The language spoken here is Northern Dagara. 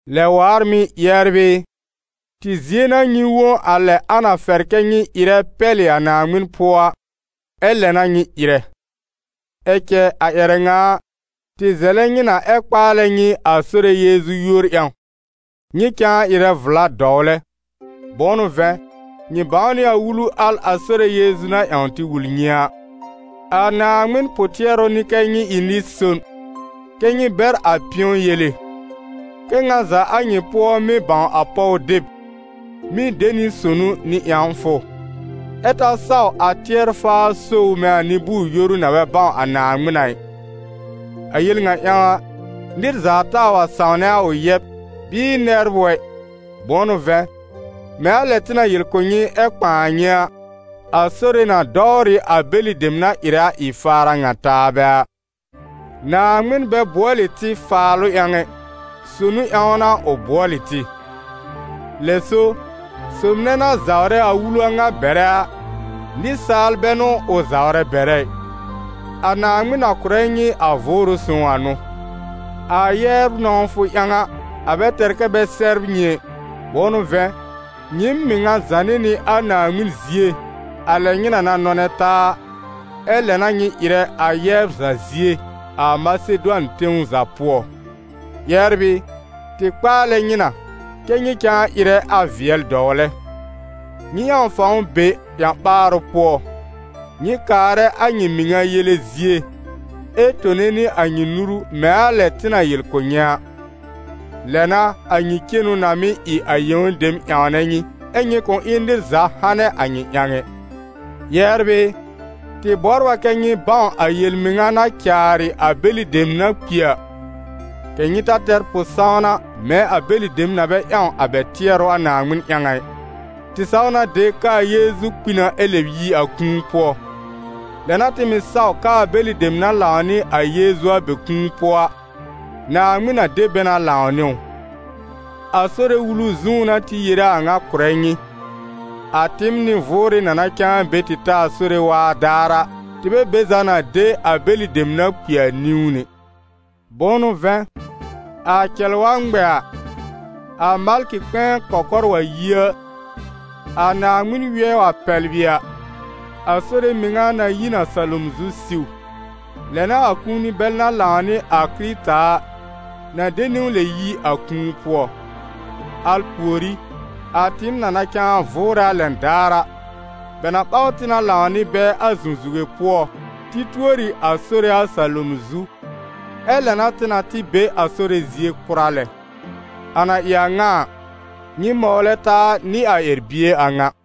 Lɛ waar mɩ̀, yɛbr ɩ, tɩ zie n'a nyɩ wõ a lɛ a na fɛr kɛ́ nyɩ ɩrɛ pɛlɩ a Naaŋmɩn pʋɔ a, ɛ lɛ n'a nyɩ ɩrɛ. Ɛ cɛ a ƴɛrɛ ŋa a, tɩ zɛlɛ nyɩ na ɛ kpaalɛ nyɩ a Sore Yeezu yúor ƴãw: nyɩ cãa ɩrɛ vla dɔwlɛ. Bʋ̃ʋ n'ʋ vɛ̃, nyɩ bãw nɩ a wulu al a Sore Yeezu na ƴãw tɩ wul nyɩ a. A Naaŋmɩn pʋ-tɩɛrʋ n'ɩ kɛ́ nyɩ ɩ nɩ-son, kɛ́ nyɩ bɛr a pɩ̃ɔ yele. Kɛ́ ŋa za a nyɩ pʋɔ mɩ́ bãw a pɔw deb, mɩ́ de nɩ sonu nɩ ƴãwfʋ, ɛ ta saw a tɩɛr-faar so ʋ mɛ̃ a nɩ-bʋʋr-yoru na bɛ bãw a Naaŋmɩn a ɩ. A yel ŋa ƴãw a, nɩr za taa wa sãwnɛ a ʋ yɛb, bɩɩ nɛbr ʋ ɛ; bʋ̃ʋ n'ʋ vɛ̃, mɛ̃ a lɛ tɩ na yel kʋ̀ nyɩ ɛ kpãa nyɩ a, a Sore na dɔwr ɩ a bɛlɩ dem na ɩrɛ a ɩ-faar a ŋa taabɛ a. Naaŋmɩn bɛ bʋɔlɩ tɩ faalʋ ƴãw ɛ, sonu ƴãw n'a ʋ bʋɔlɩ tɩ. Lɛ so, sob nɛ na zawrɛ a wulu a ŋa bɛrɛ a, nɩsaal bɛ n'ʋ ʋ zawrɛ bɛrɛ ɩ, a Naaŋmɩn na kʋ̀rɛ nyɩ a Vʋʋrʋ Sõw a n'ʋ. A yɛbr nɔ̃wfʋ ƴãw a, a bɛ tɛr kɛ́ bɛ sɛbr nyɩ ɛ, bʋ̃ʋ n'ʋ vɛ̃, nyɩɩm mɩŋa zànɩ nɩ a Naaŋmɩn zie a lɛ nyɩ na na nɔnɛ taa a, ɛ lɛ n'a nyɩ ɩrɛ a yɛbr za zie a Masedʋan tɛ̃w za pʋɔ; yɛbr ɩ, tɩ kpaalɛ nyɩ na, kɛ́ nyɩ cãa ɩrɛ a vɩɛl dɔwlɛ. Nyɩ ƴãw fãw be ƴã-ɓaarʋ pʋɔ, nyɩ kaarɛ a nyɩ mɩŋa yele zie, ɛ tone nɩ a nyɩ nuru mɛ̃ a lɛ tɩ na yel kʋ̀ nyɩ a. Lɛ n'a, a nyɩ cenu na mɩ́ ɩ a yẽw dem ƴãwnɛ nyɩ, ɛ́ nyɩ kʋ̃ ɩ nɩr za hanɛ a nyɩ ƴãw ɛ. Yɛbr ɩ, tɩ bɔbr a kɛ́ nyɩ bãw a yel-mɩŋa na caarɩ a bɛlɩ dem na mɩ́ kpi a, kɛ̀ nyɩ ta tɛr pʋ-sãwna mɛ̃ a bɛlɩ dem na bɛ ƴãw a bɛ tɩɛrʋ a Naaŋmɩn ƴãw a ɩ. Tɩ saw na de k'aa Yeezu kpi na ɛ lɛb yi a kũu pʋɔ; lɛ n'a tɩ mɩ̀ saw k'aa bɛlɩ dem na lãw nɩ a Yeezu a bɛ kũu pʋɔ a, Naaŋmɩn na de bɛ na lãw nɩ ʋ. A Sore wulu zũú n'a tɩ yere a ŋa kʋ̀rɛ nyɩ: a tɩɩm nɩ-vʋʋrɩ na na cãa be tɩ ta a Sore waa daar a, tɩ bɛ be za na de a bɛlɩ dem na kpi a niwn ɛ. Bʋ̃ʋ n'ʋ vɛ̃, a cɛl wa ŋmɛ a, a malkɩ kpɛ̃ɛ kɔkɔr wa yi a, a Naaŋmɩn wɩɛ wa pɛblɩ a, a Sore mɩŋa na yi n a salom zu siw; lɛ n'a a kũuni bɛl na lãw nɩ a Kɩrɩta a, na de niwn lɛb yi a kũu pʋɔ. Al pùorí, a tɩɩm na na cãa vʋʋrɛ a lɛn daar a, bɛ na ɓaw tɩ na lãw nɩ bɛ a zũzuge pʋɔ, tɩ tuori a Sore a salom zu, ɛ lɛ n'a tɩ na tɩ be a Sore zie kʋra lɛ. A na ɩ a ŋa a, nyɩ mɔwlɛ taa nɩ a ƴɛr-bie a ŋa.